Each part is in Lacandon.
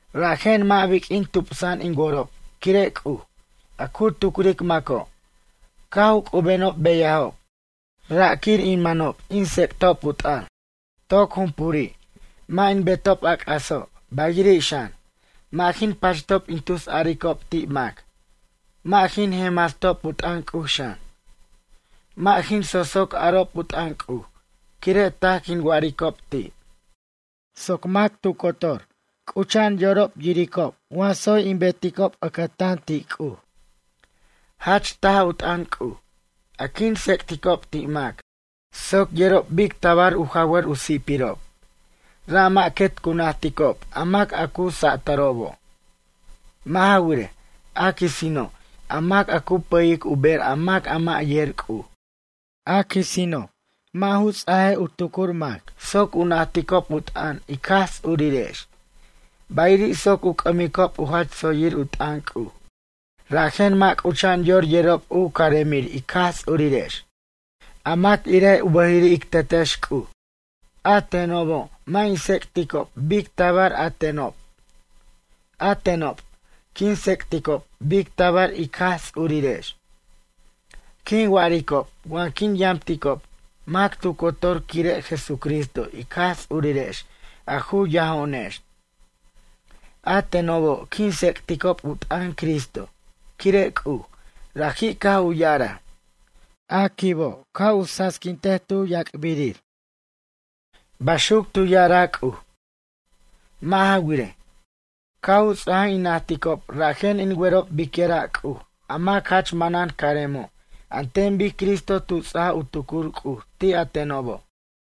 Rajen mʌ' biq'uin tupsa'an in worob quire' C'uj, a cu tucric maco', caj u c'ubenob beyajob, ra' quir in manob in tsec'tob u t'ʌn. Toc jumpuri' mʌ' in betob a c'aso', bayiri' xan, mʌ' jin pachtob in tusaricob ti' mac, mʌ' jin jenmastob u t'ʌn C'uj xan. Mʌ' jin soso' arob u t'ʌn C'uj quire' taj quin wa'aricob ti', soc mac tu cotor c'ucha'an yorob yiricob wa tsoy in beticob ʌcʌtan ti' C'uj. Jach taj u t'ʌn C'uj a quin tsec'ticob ti' mac soc yerob bic tabar u jawʌr u si'pirob, ra' mʌ' quet cu najticob a mac a cu satʌrobo'. Mʌ' ja wirej, a quisino', a mac a cu pʌyic u ber a mac a mʌ' yer C'uj. A quisino' mʌ' ju ts' u tucur mac soc u najticob u t'ʌn ic Jaj Ts'urirex, bayiri' soc u c'ʌmicob u jach tsoyir u t'ʌn C'uj. Rajen mʌ' c'ucha'an yor yerob u caremir ic Jaj Ts'urirex, a mac irej u bʌjiri' ic Tetex C'uj. A tenobo' mʌ' in tsec'ticob bic tabar a tenob. A tenob quin tsec'ticob bic tabar ic Jaj Ts'urirex. Quin wa'aricob wa quin yamticob mac tu cotor quire' Jesucristo ic Jaj Ts'urirex a ju yajo'onex. A tenobo' quin tsec'ticob u t'ʌn Cristo quire' C'uj, raji' caj u ya'araj: “A quibo' ca' u sasiquint tu yac'birir.” Baxuc tu ya'araj C'uj. Mʌ' ja wirej, caj u ts'aj in najticob rajen in werob biquira' C'uj, a mac jach manan caremo' an ten bic Cristo tu ts'aj u tucur C'uj ti' a tenobo'.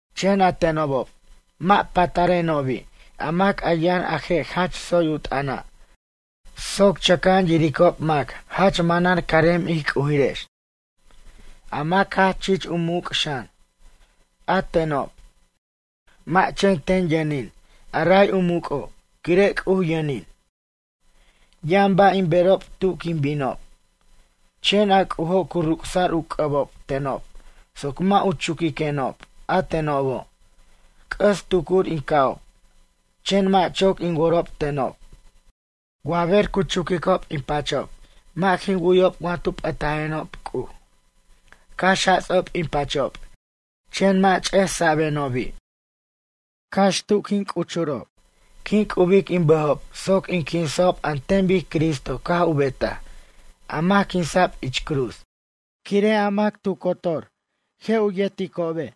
Chen a tenobob mʌ' patarenobi' a mac a yʌn a je' jach tsoy u t'ʌna' soc chʌca'an yiricob mac jach manan carem ij C'ujirex, a mac jach chich u muc' xan. A tenob, mʌ' chen ten yʌnin a ray u muc'o' quire' C'uj yʌnin. Yʌn ba' in berob tu quin binob. Chen a C'ujo' cu ruc'sa'r u c'ʌbob tenob soc mʌ' u chuquiquenob. A tenobo' c'ʌs tucur in ca'ob, chen mʌ' choc in worob tenob. Wa ber cu chuquicob in pachob mʌ' jin wu'yob wa tu p'ʌtajenob C'uj. Cax jats'ob in pachob chen mʌ' ch'esa'benobi'. Cax tu quin c'uchurob, quin c'ubic in bʌjob soc in quinsa'ob an ten bic Cristo caj u betaj, a mac quinsa'b ich cruz. Quire' a jeroj mac tu cotor je' u yerticobe'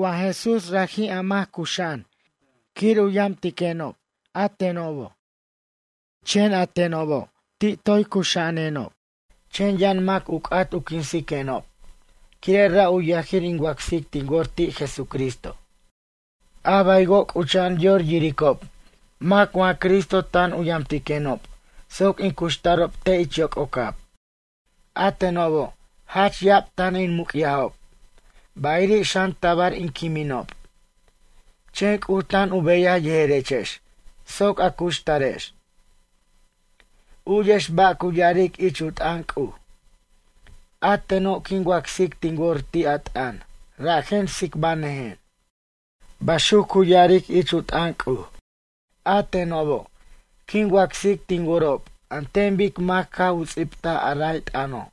wa Jesús raji' a mac cuxa'an quir u yamtenob a tenob. Chen a tenob ti' toy cuxa'anenob, chen yʌn mac u c'at u quinsiquenob quire' ra' u yajir in wacsic tin wor ti' Jesucristo. A baywo' c'ucha'an yor yiricob mac wa Cristo tan u yamtiquenob soc in cuxtarob te' ich yoc'ocab. A tenobo' jach ya'ab tan in muc'yajob, bayiri' xan tabar in quiminob, chen C'uj tan u beyaj yejerechex soc a cuxtarex. U'yex ba' cu ya'aric ich u t'ʌn C'uj: “A teno' quin wacsic tin wor ti' a t'ʌn rajen tsicbʌnʌjen.” Baxuc cu ya'aric ich u t'ʌn C'uj. A tenobo' quin wacsic tin worob an ten bic mac caj u ts'ibtaj a ray t'ʌno',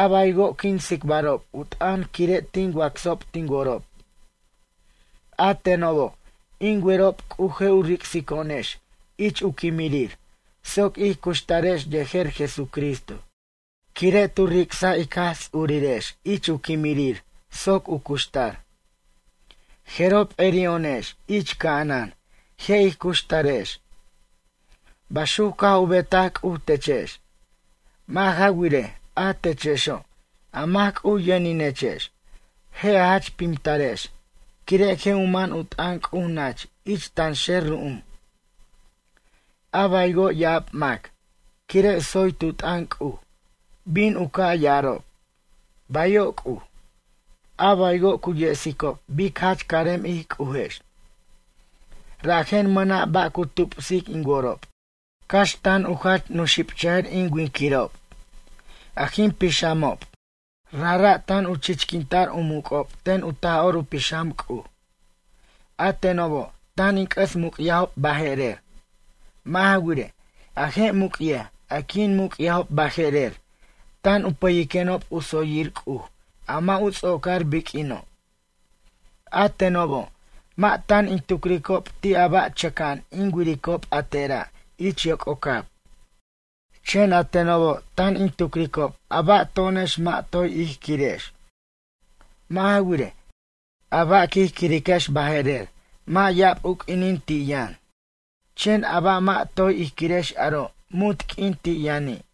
a baywo' quin tsicbarob u t'ʌn quire' tin wacsob tin worob. A tenobo' in werob C'uj je' u ric'sico'onex ich u quimirir soc ij cuxtarex yejer Jesucristo quire' tu ric'saj ic Jaj Ts'urirex ich u quimirir soc u cuxtar. Jeroj p'eri'o'onex ich ca'anan je' ij cuxtarex. Baxuc caj u betaj C'uj techex. Mʌ' ja wirej, a techexo', a mac C'uj yʌninechex, je' a jach pimtarex quire' je' u man u t'ʌn C'uj nach ich tanxer ru'um. A baywo' ya'ab mac, quire' tsoy tu t'ʌn C'uj, bin u ca' ya'arob: “Bayo' C'uj.” A baywo' cu yesicob bic jach carem ij C'ujex. Rajen mʌna' ba' cu tupsic in worob, cax tan u jach nuxibchʌjʌr in winquirob, a jin pixamob, rajra' tan u chichquinta'r u muc'ob ten u Taj'or u Pixam C'uj. A tenobo' tan in c'ʌs muc'yajob baje'rer. Mʌ' ja wirej, a je' muc'yaj a quin muc'yajob baje'rer tan u pʌyiquenob u tsoyir C'uj a mʌ' u ts'ocar biq'uino'. A tenobo' mʌ' tan in tucricob ti' a ba' chʌca'an in wiricob a tera' ich yoc'ocab. Chen a tenobo' tan in tucricob a ba' to'onex mʌ' toy ij quirex. Mʌ' ja wirej, a ba' quij quiriquex baje'rer mʌ' ya'ab u q'uinin ti' yʌn, chen a ba' mʌ' toy ij quirex aro' munt q'uin ti' yʌni'.